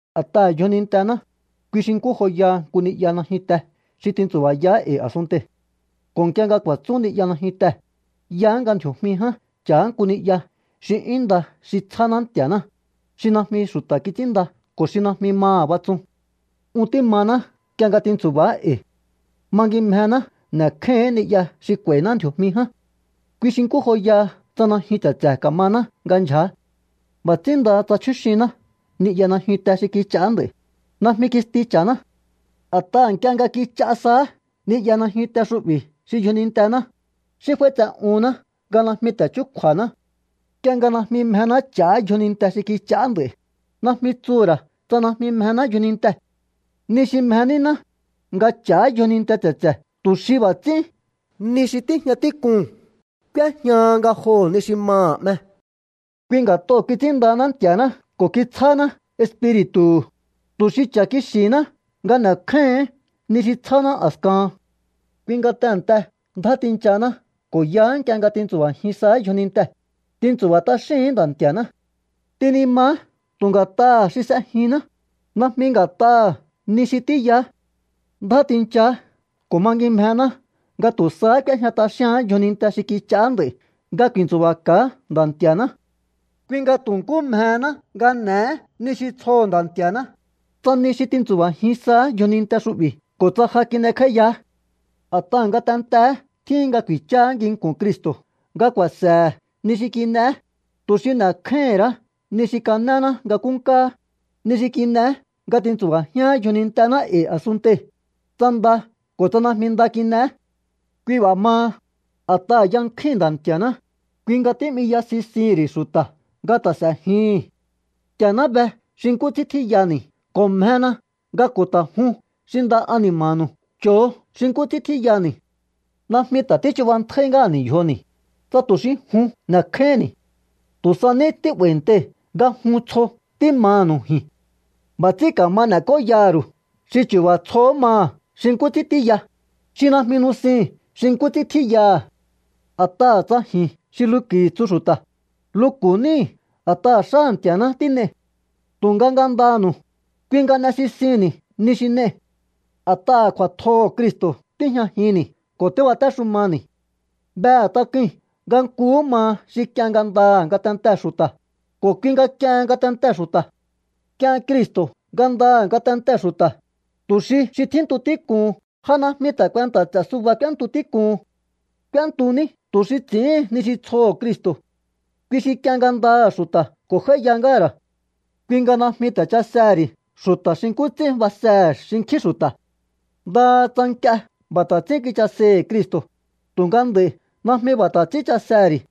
A̱t'aha̱ yjonintená, kui xi nkú joyaha nku ni'ya najyunte xi tintsu̱ba̱yaá e̱i̱ a̱sunntei̱. Ko̱ nk'ie nga ku̱a̱tsún ni'ya najyuntee̱, yaá nga ndji̱o̱jmi ján ch'a̱á nku ni'ya xi 'yún nda xi tsjáná Nti̱a̱ná, xi najmi xu̱ta̱ kits'ínnda ko̱ xi najmi maha̱ batsun. Un tímaná nk'ie nga tintsu̱ba̱á e̱i̱. Mangimjená n'e̱kjáíhi̱ín ni'ya xi k'u̱a̱i̱ná ndji̱o̱jmi ján. Kui xi nkú joyaha tsa najyun tse̱tse̱ ka̱maná nga ndyja̱á. B'a̱ ts'ín ndaha tsa chjúxiná ni'ya najyunte xi kich'aá nd'a̱i̱, najmi kisti cha̱ná. A̱t'aha̱ nk'ie nga kich'a saá ni'ya najyunte xu'bi̱ xi yjonintená, xí f'áítse'uhúnná nga najmi ta̱ chúkju̱a̱haná. Nk'ie nga najmi mjená ch'a̱á yjoninte xi kich'aá nd'a̱i̱, najmi tsuhu̱ ra̱ tsa najmi mjená yjoninte. Ni xi mje nínáá, nga ch'a̱á yjoninte tse̱tse̱ tu̱ xi b'a̱ ts'ín ni xi tíjña tík'uu̱n k'úéjñaha ngajoho̱ ni xi maha̱ 'me. Kui nga̱t'oo̱ kits'ínndahaná Nti̱a̱ná ko̱ kitsjáná Espiri̱tu̱hu̱, tu̱ xi cha̱ kixi̱hiná nga n'e̱kjáíhi̱ín ni xi tsjáná a̱skahan. Kui nga tehe̱nte ndjá tinchahaná ko̱ yaá nk'ie nga tintsu̱ba̱jin saá yjonintee̱, tintsu̱ba̱ t'axíhi̱ín Nda̱ Nti̱a̱ná. Tinimaá tu̱ nga̱t'aha̱ xi s'ejinná, najmi nga̱t'aha̱ ni xi tíyaá. Ndjá tinchaá ko̱ mangimjená nga tu̱ sahá k'úéjña t'axíaán yjoninte xi kich'aá nd'a̱i̱ nga ku̱i̱ntsu̱ba̱ka̱á Nda̱ Nti̱a̱ná. Kui nga tu̱ nkú mjehéná nga n'e̱é ni xi tsjoho̱ Nda̱ Nti̱a̱ná, tsa ni xi tintsu̱ba̱jin saá yjoninte xu'bi̱ ko̱ tsa ja kin'ekj'áíyaá. A̱t'aha̱ ngatenteé tjíhin nga ku̱i̱cháá nginku̱n Cristo̱ nga ku̱a̱se̱he̱ ni xi kin'eé, tu̱ xi n'e̱kjáíhi̱n ra̱á ni xi kanéná nga nkúnkáá, ni xi kin'eé nga tintsu̱ba̱jián yjonintená e̱i̱ a̱sunntei̱, tsa nda ko̱ tsa najmi nda kin'eé. Kui b'a̱ maha, a̱t'aha̱ yankjúi̱n Nda̱ Nti̱a̱ná, kui nga tí'miya sisihi̱n ri̱ xu̱ta̱ nga ta̱ s'e̱jihi̱n. Nti̱a̱ná be xi nkú ts'ín tjíyani̱ ko̱ mjena nga ko̱ ta̱ jun xi nda ani̱ma̱nu̱u cho̱o xi nkú ts'ín tjíyani̱. Najmi ta̱ tíchubantjáí ngáha̱ni̱ yjoni̱, tsa tu̱ xi jun n'e̱kjáíhi̱nni̱. Tu̱ sa ní tí'ba̱i̱ntei̱ nga jun tsjo tímanu̱u ji̱n. B'a̱ ts'ín ka̱ma n'e̱k'óyaha̱ ru̱u xi chu̱ba̱ tsjohó maha̱ xi nkú ts'ín tíya, xi̱ najmi nusihi̱n xi nkú ts'ín tjíyaha̱. A̱t'aha̱ tsa ji̱n xi luku̱i̱ tsu xu̱ta̱, luku̱ níi̱ a̱t'aha̱ xáha̱ Nti̱a̱ná tín'ei̱. Tunga ngandanu̱u, kui nga n'esisihi̱nni̱ ni xi n'ei̱. A̱t'aha̱ kju̱a̱tjoho̱ Cristo̱ tíjñajinni̱ ko̱ tíbatéxumani̱. Behe̱ tak'ui̱n nga nkuhú maha xi k'ien ngandaha̱ ngatentee̱ xu̱ta̱, ko̱ kui nga k'iehen ngatentee̱ xu̱ta̱. K'ien Cristo̱ ngandaha̱ ngatentee̱ xu̱ta̱, tu̱ xi xi tjíntu tík'uhun ja najmi ta̱ kuenta̱ ts'e̱ suba k'úéntu tík'uhun. K'úéntu ní tu̱ xi ts'i̱íhin ni xi tsjoho̱ Cristo̱. Kui xi k'ien ngandaha̱ xu̱ta̱ ko̱ j'áíya ngáha̱ ra̱. Kui nga najmi ta̱ chasehe̱ ri̱ xu̱ta̱ xi nkú ts'ín basehe̱ xinkjín xu̱ta̱. Ndaha tsa nk'ie b'a̱ ta̱ ts'ín kichasei̱hi̱ Cristo̱, tu̱nga nd'a̱i̱ najmi b'a̱ ta̱ ts'ín chasehe̱ ri̱.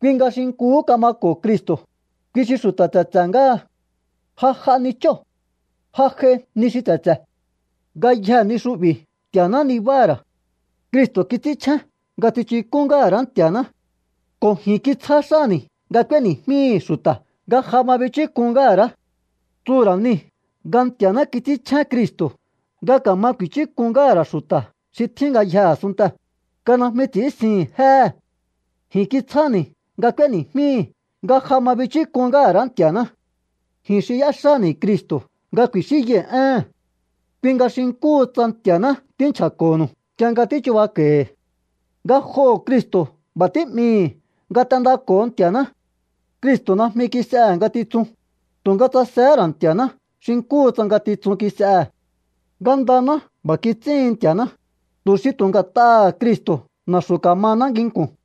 Kui nga xi nkuhú kamako̱ Cristo̱, kui xi xu̱ta̱ tse̱tse̱ ngáha. Ja j'a ni chóo̱. Ja j'ai ni xi tse̱tse̱. Ngayjee̱ ni xu'bi̱ Nti̱a̱ná nibáha̱ ra̱. Cristo̱ kits'ínchjén nga tsichuk'ún ngáha̱ ra̱á Nti̱a̱ná. Ko̱ ji̱n kitsjá xáni̱ nga k'úéni̱jmíi̱hi̱ xu̱ta̱ nga ja ma bichúk'un ngáha̱ ra̱. Tsuhu̱ ra̱ nii̱ nga Nti̱a̱ná kits'ínchjén Cristo̱ nga ka̱ma ku̱i̱chúk'un ngáha̱ ra̱ xu̱ta̱ xi tjín ngayjee̱ a̱sunntee̱, nga najmi ts'i̱ínsihi̱n jéhe̱. Ji̱n kitsjáni̱ nga k'úéni̱jmíi̱ nga ja ma bichúk'un ngáha̱ ra̱á Nti̱a̱ná. Ji̱n xi y'éxáni̱ Cristo̱ nga ku̱i̱xínyai̱ éhe̱n. Kui nga xi nkúhu tsa Nti̱a̱ná tínchja̱ko̱nu̱u nk'ie nga tíchubako̱i̱hi̱. Ngajoho̱ Cristo̱ b'a̱ tí'mii̱hi̱ nga t'endako̱o Nti̱a̱ná. Cristo̱ najmi kis'ehe̱ ngatitsun, tu̱nga tsasehé ra̱ Nti̱a̱ná xi nkúhu tsa ngatitsun kis'ehe̱. Ngandaná b'a̱ kits'íhin Nti̱a̱ná, tu̱ xi tu̱ nga̱t'aha̱ Cristo̱ na̱xu̱ ka̱mahaná nginku̱n.